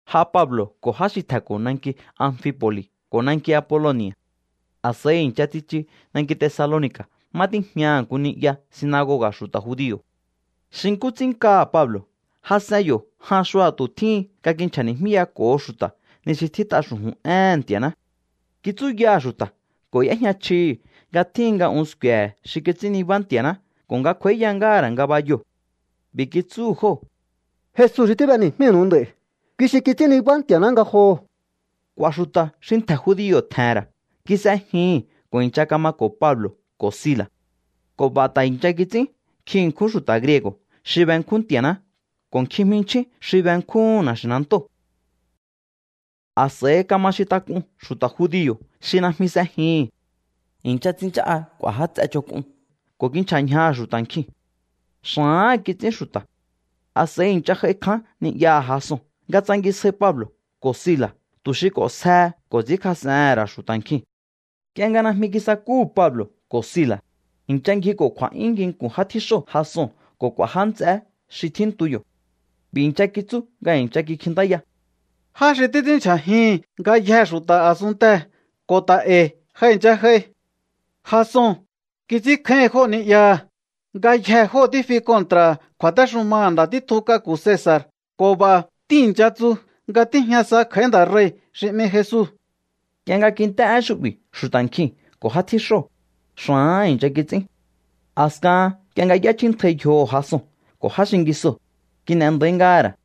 J'a Pablo̱ ko̱ já xi tje̱nko̱ nanki Amfipo̱li̱ ko̱ nanki Apoloni̱a̱. A̱s'a̱i i̱ncha tsichu nanki Tesaloni̱ka̱ má tíjñaha̱ nku ni'ya sinagoga̱ xu̱ta̱ judio̱. Xi nkú ts'ín nkaha̱ Pablo̱ jas'en yo̱ jan xua̱tu̱ tjíhin nga kinchja̱ni̱jmíyako̱ho xu̱ta̱ ni xi tjít'a xu̱ju̱n éhe̱n Nti̱a̱ná. Kitsúyaha̱ xu̱ta̱ ko̱ y'éjña chjihi̱ nga tjíhin nga un sku̱e̱he̱ xi kits'ín nibá Nti̱a̱ná ko̱ nga kj'u̱a̱íya ngáha̱ ra̱ ngabayoo̱. B'i̱ kitsúhu̱ jóo̱: —Jesu xi tíb'eni̱jmínu̱u nd'a̱i̱, kui xi kits'ín nibá Nti̱a̱ná ngajoho̱. K'u̱a̱ xu̱ta̱ xi ntje̱ judio̱ tje̱he̱n ra̱ kis'ejihi̱n ko̱ i̱ncha kamako̱ Pablo̱ ko̱ Sila̱. Ko̱ b'a̱ ta̱ i̱ncha kits'ín nkjin ṉkjún xu̱ta̱ griego̱ xi benkjún Nti̱a̱ná ko̱ nkjin jminchjín xi benkjúhu̱n na̱xi̱nantóo̱. A̱s'a̱i kama xintak'un xu̱ta̱ judio̱ xi najmi s'ejihi̱n. I̱ncha tsinchá'a k'u̱a̱ já ts'e ch'onk'un ko̱ kinchja̱ ñjaha̱ xu̱ta̱ nkjiu̱n. Xa̱áha̱n kits'ín xu̱ta̱. A̱s'a̱i i̱ncha j'ai kján ni'yaha̱ Jason nga tsangisjai Pablo̱ ko̱ Sila̱ tu̱ xi k'o̱nsjehe ko̱ ts'i̱ínkjas'ehe̱n ra̱ xu̱ta̱ nkjiu̱n. Nk'ie nga najmi kisakúhu̱ Pablo̱ ko̱ Sila̱, i̱ncha ngjiko̱ kju̱a̱'yún nginku̱n já tjíxóo̱ Jason ko̱ k'u̱a̱ já nts'eé xi tjíntu yo̱. B'i̱ i̱ncha kitsú nga i̱ncha kikjintáya: —Já xi títs'ínndyja̱jihi̱n ngayjee̱ xu̱ta̱ a̱sunntee̱ ta̱ ko̱ e̱i̱ ja i̱ncha j'ai. Jason kits'ínkjáíhi̱n jóo̱ ni'yaha̱. Ngayjee̱ jóo̱ tífi kontra̱ha̱ kju̱a̱téxumaha̱ nda̱ títjun k'aku̱ Cesa̱r ko̱ b'a̱ tíi̱ncha tsu nga tíjña sa kj'a̱í nda̱ rei̱ xi 'mi Jesu. Nk'ie nga kint'é én xu'bi̱ xu̱ta̱ nkjiu̱n ko̱ já tjíxóo̱, xa̱áha̱n i̱ncha kits'ín. A̱skahan nk'ie nga y'échjíntjai yjoho̱ Jason ko̱ já xingisoo̱, kin'e nda̱í ngáha̱ ra̱.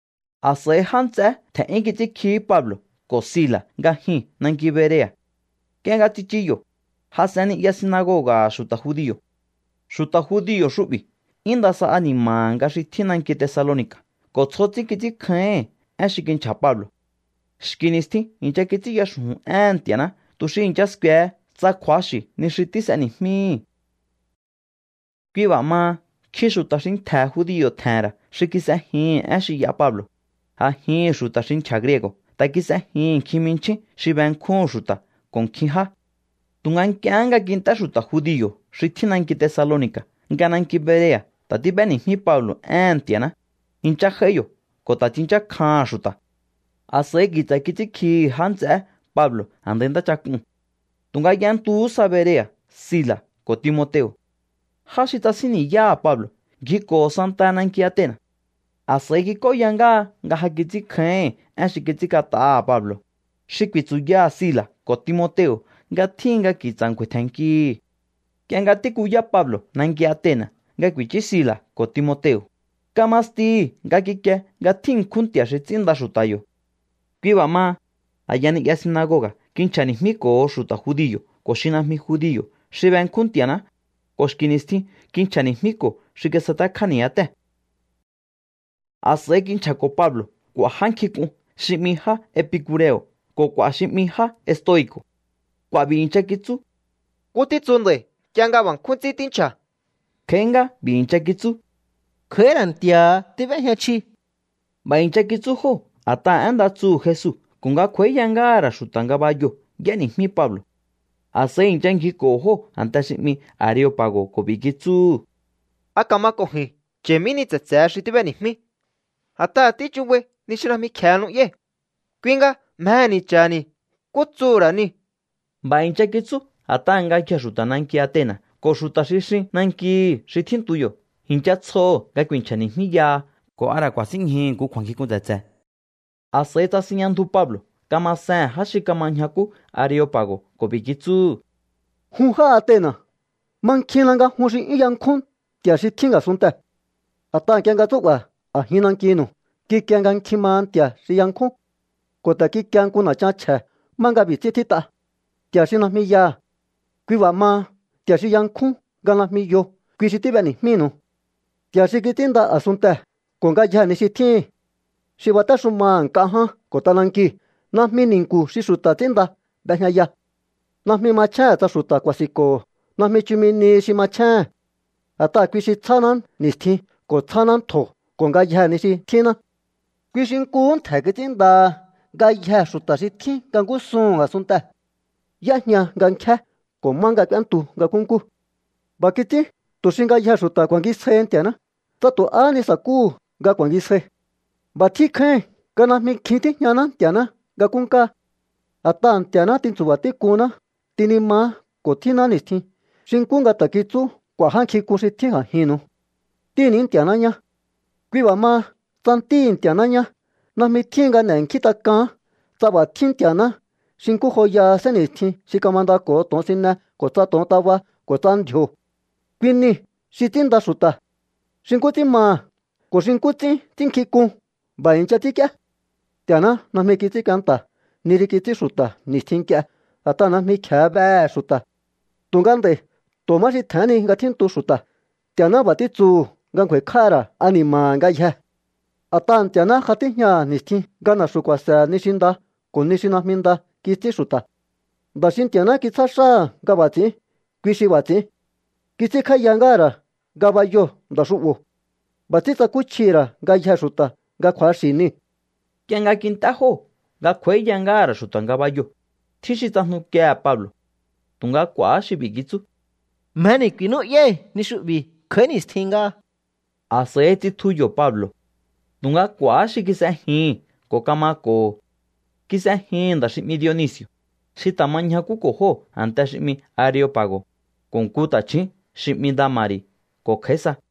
A̱s'a̱i já nts'eé tje̱n'yún kits'ínkjihí Pablo̱ ko̱ Sila̱ nga jyuu̱n nanki Berea̱. Nk'ie nga tsichu yo̱, jas'en ni'ya sinagoga̱ha̱ xu̱ta̱ judio̱. Xu̱ta̱ judio̱ xu'bi̱ 'yún nda sa ani̱ma̱ha̱ nga xi tjín nanki Tesaloni̱ka̱ ko̱ tsjo ts'ín kits'ínkjáíhi̱n én xi kinchja̱ Pablo̱. Xki̱ ni̱stjin i̱ncha kits'ínya xu̱ju̱n éhe̱n Nti̱a̱ná tu̱ xi i̱ncha sku̱e̱he tsa kju̱axi̱ ni xi tís'eni̱jmíhi̱. Kui b'a̱ maha, nkjin xu̱ta̱ xi ntje̱ judio̱ tje̱he̱n ra̱ xi kis'ejihi̱n én xi y'a Pablo̱. A̱jihi̱n xu̱ta̱ xi nchja̱ griego̱ ta̱ kis'ejihi̱n nkjin jminchjín xi benkjúhu̱n xu̱ta̱ ko̱ nkjin já. Tu̱nga nk'iehé nga kint'é xu̱ta̱ judio̱ xi tjín nanki Tesaloni̱ka̱ nga nanki Berea̱ ta̱ tíb'éni̱jmí Pablo̱ éhe̱n Nti̱a̱ná, i̱ncha j'ai yo̱ ko̱ ta̱ tsinchákjaha̱n xu̱ta̱. A̱s'a̱i ki̱tsa̱ kits'ínkjihi̱ já nts'eé Pablo̱ a̱ndai ntáchak'uu̱n. Tu̱nga y'entuhú sa Berea̱ Sila̱ ko̱ Timoteo̱. Já xi tsasín ni̱yáha̱ Pablo̱ ngjiko̱ho̱ santaha nanki Atena̱. A̱s'a̱i kik'óya ngáha nga ja kits'ínkjáíhi̱n én xi kits'ínk'at'aha̱ Pablo̱, xi ku̱i̱tsu̱yaha̱ Sila̱ ko̱ Timoteo̱ nga tjíhin nga ki̱tsa̱ ngju̱a̱i̱ tje̱nnkihi̱. Nk'ie nga tíkuyá Pablo̱ nanki Atena̱ nga ku̱i̱chú Sila̱ ko̱ Timoteo̱, kama stihi̱ nga kikie nga tjín ṉkjún nti̱a̱ xi ts'ínnda xu̱ta̱ yo̱. Kui b'a̱ maha, a̱ya ni'ya sinagoga̱ kinchja̱ni̱jmíko̱ho xu̱ta̱ judio̱ ko̱ xi najmi judio̱ xi benkjún Nti̱a̱ná, ko̱ xki̱ ni̱stjin kinchja̱ni̱jmíko̱ xi kisatekjá ni̱yátée̱. A̱s'a̱i kinchja̱ko̱ Pablo̱ k'u̱a̱ já nkjink'un xi 'mi já epicure̱o̱ ko̱ k'u̱a̱ xi 'mi já estoi̱co̱. K'u̱a̱ b'i̱ i̱ncha kitsú: —¿Nkú títsu nda̱i̱ nk'ie nga b'a̱ nkjún ts'ín tínchja̱? Kj'a̱í ngá b'i̱ i̱ncha kitsú: —Kj'a̱í ra̱ nti̱a̱ha tíb'éjña chji. B'a̱ i̱ncha kitsú jóo̱ a̱t'aha̱ én nda tsuhu̱ Jesu ko̱ nga kj'u̱a̱íya ngáha̱ ra̱ xu̱ta̱ ngabayoo̱ y'éni̱jmí Pablo̱. A̱s'a̱i i̱ncha ngjiko̱ho̱ jóo̱ a̱nte xi 'mi Areopa̱go̱ ko̱ b'i̱ kitsúhu̱: —¿A ka̱ma ko̱ ji̱n cha̱i̱ mí ni tse̱tse̱he xi tíb'eni̱jmí? A̱t'aha̱ tíchubai ni xi najmi kje̱e nu'yái̱. Kui nga mjehe̱ni̱ cha̱ha̱ni̱ nkú tsuhu̱ ra̱ niu̱. B'a̱ i̱ncha kitsú a̱t'aha̱ ngayjee̱ xu̱ta̱ nanki Atena̱ ko̱ xu̱ta̱ xi xin nankihi̱ xi tjíntu yo̱ i̱ncha tsjoho̱ nga ku̱i̱nchja̱ni̱jmíyaha ko̱ a ra̱ ku̱a̱sínñjuhu̱ nku kju̱a̱nkjink'un tse̱tse̱. A̱s'a̱i tsasinjña ndju Pablo̱ kamasehe̱n já xi kama ñjakú Areopa̱go̱ ko̱ b'i̱ kitsúhu̱: —Jun já Atena̱, mankjinna nga jun xi 'yún yankjún nti̱a̱ xi tjín a̱sunntee̱. A̱t'aha̱ nk'ie nga tsú'ba̱ a̱jin nankinu̱u, kikie nga nkjin maha nti̱a̱ xi yankjún. Ko̱ ta̱ kikie nku na̱chan chje̱ má nga b'i̱ ts'ín tjít'a: “Nti̱a̱ xi najmi yaha̱.” Kui b'a̱ maha, Nti̱a̱ xi yankjún nga najmi yo, kui xi tíb'eni̱jmínu̱u. ’Nti̱a̱ xi kits'ínnda a̱sunntee̱ ko̱ ngayjee̱ ni xi tjíhi̱n, xi batéxumaha̱ nk'a ján ko̱ t'anankiu̱, najmi ni̱nku̱ xi xu̱ta̱ ts'ínnda b'ejñaya. Najmi machjéhe̱n tsa xu̱ta̱ ku̱a̱si̱nko̱ho̱. Najmi chumi nihi xi machjéhe̱n. A̱t'aha̱ kui xi tsjáná ni̱stjin ko̱ tsjáná ntjo̱ ko̱ ngayjee̱ ni xi tjínná. Kui xi nkuhú ntje̱ kits'ínndaha ngayjee̱ xu̱ta̱ xi tjín nga ngúsuhu̱n a̱sunntee̱. Y'éjña nga nkjé ko̱ má nga k'úéntu nga nkúnkú. ’B'a̱ kits'ín tu̱ xi ngayjee̱ xu̱ta̱ ku̱a̱ngisjaihi Nti̱a̱ná, tsa tu̱ ahá ni sa̱kúhu̱ nga ku̱a̱ngisjai. B'a̱ tjín kjáíhin nga najmi kjin tíjñaná Nti̱a̱ná nga nkúnkáá. A̱t'aha̱ Nti̱a̱ná tintsu̱ba̱ tík'uhunná, tinimaá ko̱ tjínná ni̱stjin, xi nkú nga ta̱ kitsú k'u̱a̱ já nkjink'un xi tjín a̱jinnu̱u: “Ntíhi̱ ní Nti̱a̱ná ñá.” ’Kui b'a̱ maha, tsa ntíhi̱ Nti̱a̱ná ñá, najmi tjíhin nga n'e̱nkjíntak'aán tsa b'a̱ tjín Nti̱a̱ná xi nkú joyaha sénni̱stjin xi kamandako̱ho to̱onsine ko̱ tsa to̱ontaba ko̱ tsa ndji̱o̱. Kui niu̱ xi ts'ínnda xu̱ta̱. Xi nkú ts'ín maha̱ ko̱ xi nkú ts'ín ts'ínnkjink'un, b'a̱ i̱ncha ts'ínk'íé. ’Nti̱a̱ná najmi kits'ín kuenta̱ ni xi kits'ín xu̱ta̱ ni̱stjin nk'ie, a̱t'aha̱ najmi kje̱e behe̱ xu̱ta̱. Tu̱nga nd'a̱i̱ tu̱ má xi tje̱hén ni nga tjíntu xu̱ta̱ Nti̱a̱ná b'a̱ títsuhu̱ nga ngju̱a̱i̱kj'áha̱ ra̱ ani̱ma̱ha̱ ngayjee̱. A̱t'aha̱ Nti̱a̱ná ja tíjñaha̱ ni̱stjin nga na̱xu̱ ku̱a̱se̱he̱ ni xi nda ko̱ ni xi najmi nda kits'ín xu̱ta̱. Nda̱ xi Nti̱a̱ná kitsjá xáha̱ nga b'a̱ ts'i̱ín, kui xi b'a̱ ts'i̱ín. Kits'ínkj'áíya ngáha̱ ra̱ ngabayoo̱ nda̱ xu'bo̱. B'a̱ ts'ín tsakúchjihi̱ ra̱ ngayjee̱ xu̱ta̱ nga kju̱axi̱ niu̱. Nk'ie nga kint'é jóo̱ nga kj'u̱a̱íya ngáha̱ ra̱ xu̱ta̱ ngabayoo̱, tjín xi tsajnukiehe̱ Pablo̱. Tu̱nga k'u̱a̱há xi b'i̱ kitsú: —Mjeni̱ ku̱i̱nú'yái̱ ni xu'bi̱ kj'a̱í ni̱stjin ngáha. A̱s'a̱i tsitju yo̱ Pablo̱. Tu̱nga k'u̱a̱há xi kis'ejihi̱n ko̱ kamako̱ho̱. Kis'ejihi̱n nda̱ xi 'mi Dionisi̱o̱, xi ta̱ ma ñjakúko̱ jóo̱ a̱nte xi 'mi Areopa̱go̱, ko̱ nku ta̱chju̱ún xi 'mi Dama̱ri̱ ko̱ kj'a̱í sa.